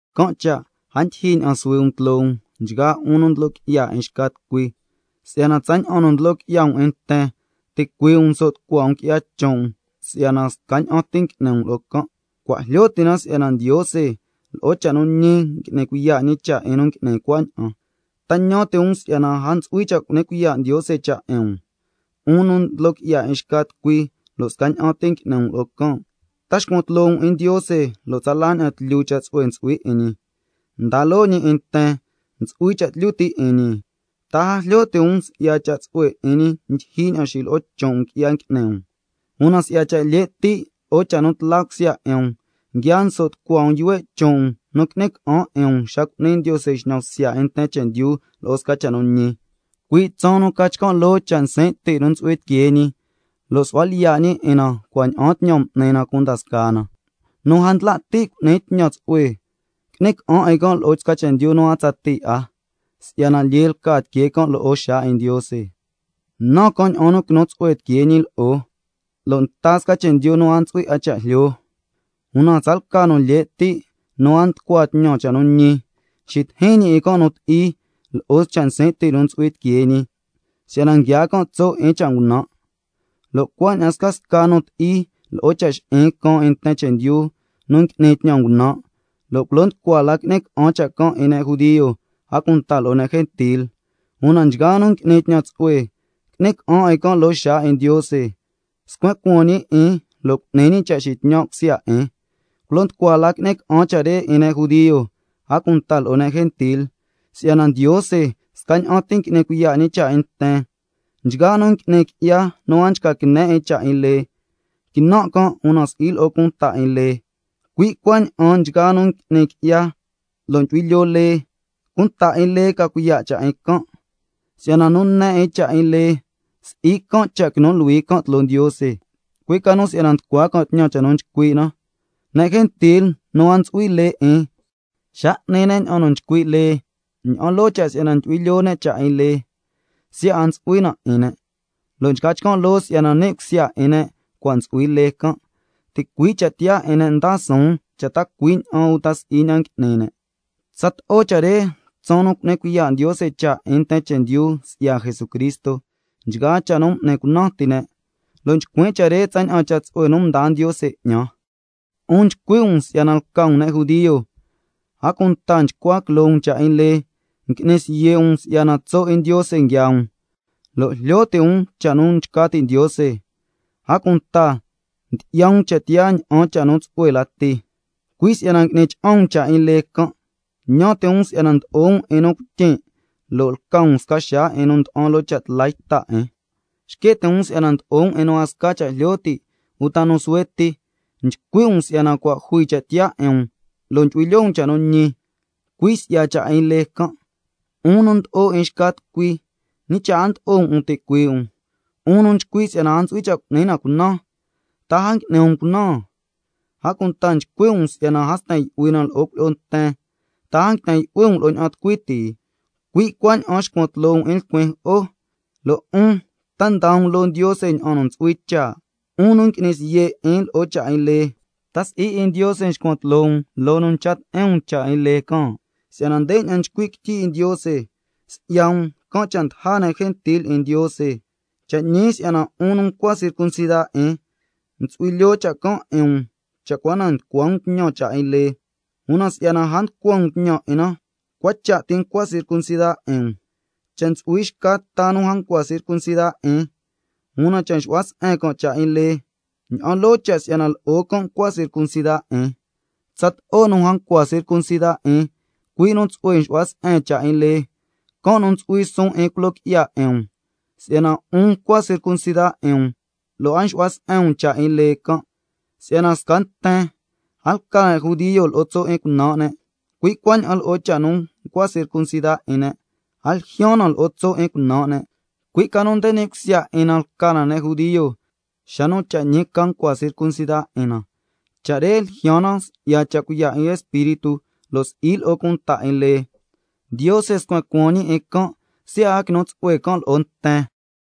Can' cha' a ndyijyi ña'an suhui um tloo um, nchgaa 'un nu ndlo qui'ya 'in xca tucui, si'yana tsaña'an nu ndlo qui'ya um 'in nten, ticuii' um nso' tucua um qui'ya chon' um, si'yana scaña'an ti ngui'ni um lo'o can'. Cua' jlyo ti' na si'yana Ndiose lo'o cha' nu ñi n'ni cuiya' ñi cha' 'in nu ngui'ni cuaña'an. ¿Ta ñan ti' um si'yana a ntsu'hui cha' cu'ni cuiya' Ndiose cha' 'in um, 'un nu ndlo qui'ya 'in xca tucui lo' scaña'an ti ngui'ni um lo'o can'? ¿Ta nxcuan tloo um 'in Ndiose, lo' tsala ña'an tlyu cha' tsu'hue ntsu'hui 'in ñi, ndaa loo ñi 'in nten, ntsu'hui cha' tlyu ti' 'in ñi? ¿Ta a jlyo ti' um si'ya cha' tsu'hue 'in ñi ndyijyi ña'an xilo'o chon' um qui'ya ngui'ni um? Una si'ya cha' lye' ti' lo'o cha' nu tla cusya 'in um, nguia nso' tucua um yuhue' chon' um nu qui'ni ca'an 'in um xa cu'ni Ndiose xñan bsya 'in nten chendyu lo'o sca cha' nu ñi, cui' tsaan nu ca chcan' loo cha' nsin' ti' nu ntsu'hui tiquee ñi, —lo' su'hua lyiya' ñi 'in na cua' ña'aan tñan m'ni na cunda scaa na—: Nu a ndla' ti' cu'ni tñan tsu'hue, qui'ni ca'an 'in lo'o chendyu nu a tsatii 'a, si'yana lyee lca tiquee can' lo'o xaa 'in Ndiose, nan can' ña'an nu quinu tsu'hue tiquee ñi lo'o, lo' nta sca chendyu nu a ntsu'hui 'a cha' jlyo. Una tsalca nu lye' ti' nu a nducua tñan cha' nu ñi, xitijin ñi 'in can' nu ti'i lo'o cha' nsin' ti' nu ntsu'hui tiquee ñi, si'yana nguiaa can' tso' 'in cha' ngunan', lo' cuaña'an scasca nu ti'i lo'o cha' xi'in caan 'in nten chendyu nu ngui'ni tñan ngunan', lo' culo nducua la qui'ni ca'an cha' can' 'in ne' judio, a cunta lo'o ne' gentil. Una nchgaa nu ngui'ni tñan tsu'hue qui'ni ca'an 'in can' loo xaa 'in Ndiose, scuen cuaan ñi 'in can' lo' a sca la cha' chu'hui tiquee, culo nducua la qui'ni ca'an cha' can' 'in ne' judio, a cunta lo'o ne' gentil, si'yana Ndiose scaña'an ti ngui'ni cuiya' ñi cha' 'in nten. Nchgaa nu ngui'ni qui'ya nu a nchca quine 'in cha' 'in lee, quinan' can', una si'i lo'o cunta 'in lee, cui' cuaña'an nchgaa nu ngui'ni qui'ya lo' ndyu'hui lyoo lee, cunta 'in lee ca cuiya' cha' 'in can', si'yana nu ne 'in cha' 'in lee, si'i can' nu quinu luhui tloo Ndiose, cui' ca nu si'yana nducua can' tñan cha' nu nchcui' na. Ne' gentil nu a ntsu'hui lee 'in, xa n'ni ne' ña'an nu nchcui' lee, ña'an loo cha' si'yana ndyu'hui lyoo ne' cha' 'in lee, siya' a ntsu'hui na 'in ne', lo' nchca chcan' loo si'yana ni' cusya 'in ne' cua' ntsu'hui lee can', ticui' cha' tiyaa 'in ne' ndaa suun cha' ta cui' ña'an uta si'i ña'an ngui'ni ne'. Tsato'o cha' re tsaan nu cu'ni cuiya' Ndiose cha' 'in nten chendyu si'ya Jesucristo, nchgaa cha' nu m'ni cunan ti ne', lo' nchcuin' cha' re tsaña'an cha' tsu'hue nu mdaa Ndiose 'ñan. 'Un nchcui' um si'yana lca um ne' judio, a cunta nchcua quiloo um cha' 'in lee, ngui'ni siye' um si'yana tso' 'in Ndiose nguiaa um, lo' jlyo ti' um cha' nu nchca ti' Ndiose, a cunta ndyi'ya um cha' tiyaa ña'an cha' nu tsu'hue lati, cui' si'yana ngui'ni cha'an um cha' 'in lee can'. Ñan ti' um si'yana ndlo'o um 'in nu cuityin', lo' lca um sca xaa 'in nu nda'an lo'o cha' tla yta 'in, xque' ti' um si'yana ndlo'o um 'in nu a sca cha' jlyo ti' uta 'in nu suhue ti, nchcui' um si'yana cua' jui cha' tiyaa 'in um lo' ndyu'hui lyoo um cha' nu ñi, cui' si'ya cha' 'in lee can'. 'Un nu ndlo'o 'in xca tucui, ¿ñi cha' a ndlo'o um 'in um ticuii' um? 'Un nu nchcui' si'yana a ntsu'hui cha' cu'ni na cunan, ¿ta a ngui'ni um cunan? A cunta nchcui' um si'yana a sten yu'hui na lo'o cuilyi'o nten, ¿ta a nguiten yu'hui um lo'o ña'an tucui ti? Cui' cuaña'an nxcuan tloo um 'in lcuin jo'o, lo' 'un ¿ta nda um loo Ndiose ña'an nu ntsu'hui cha'? 'Un nu ngui'ni siye' 'in lo'o cha' 'in lee, ¿ta si'i 'in Ndiose nxcuan tloo um loo nu ncha ti'in um cha' 'in lee can'? Si'yana ndeña'an nchcui' quityi 'in Ndiose: —Si'ya um, can' cha' ndaja ne' gentil 'in Ndiose—. Cha' ñi si'yana 'un nu ncua circuncida 'in, ntsu'hui lyoo cha' can' 'in um cha' cua na nducua um tñan cha' 'in lee, una si'yana a nducua um tñan 'in na, cua cha' ti ncua circuncida 'in um. Cha' ntsu'hui xca ta nu a ncua circuncida 'in, una cha' nxu'hua se'en can' cha' 'in lee, ña'an loo cha' si'yana lo'o can' ncua circuncida 'in. Tsato'o nu a ncua circuncida 'in, cui' nu tsu'hue nxu'hua se'en cha' 'in lee, can' nu ntsu'hui suun 'in culo qui'ya 'in um, si'yana 'un ncua circuncida 'in um lo' a nxu'hua se'en um cha' 'in lee can'. Si'yana sca nten, a lca ne' judio lo'o tso' 'in cunan' ne', cui' cuaña'an lo'o cha' nu nchca circuncida 'in ne', a ljyaan na lo'o tso' 'in cunan' ne', cui' ca nu nde ni' cusya 'in na lca na ne' judio, xa nu cha' ñi ca nchca circuncida 'in na, cha' re ljyaan na si'ya cha' cuiya' 'in Espíritu lo' si'i lo'o cunta 'in lee, can' nu quinu tsu'hue lo'o Ndiose, lo' si'i lo'o nten chendyu.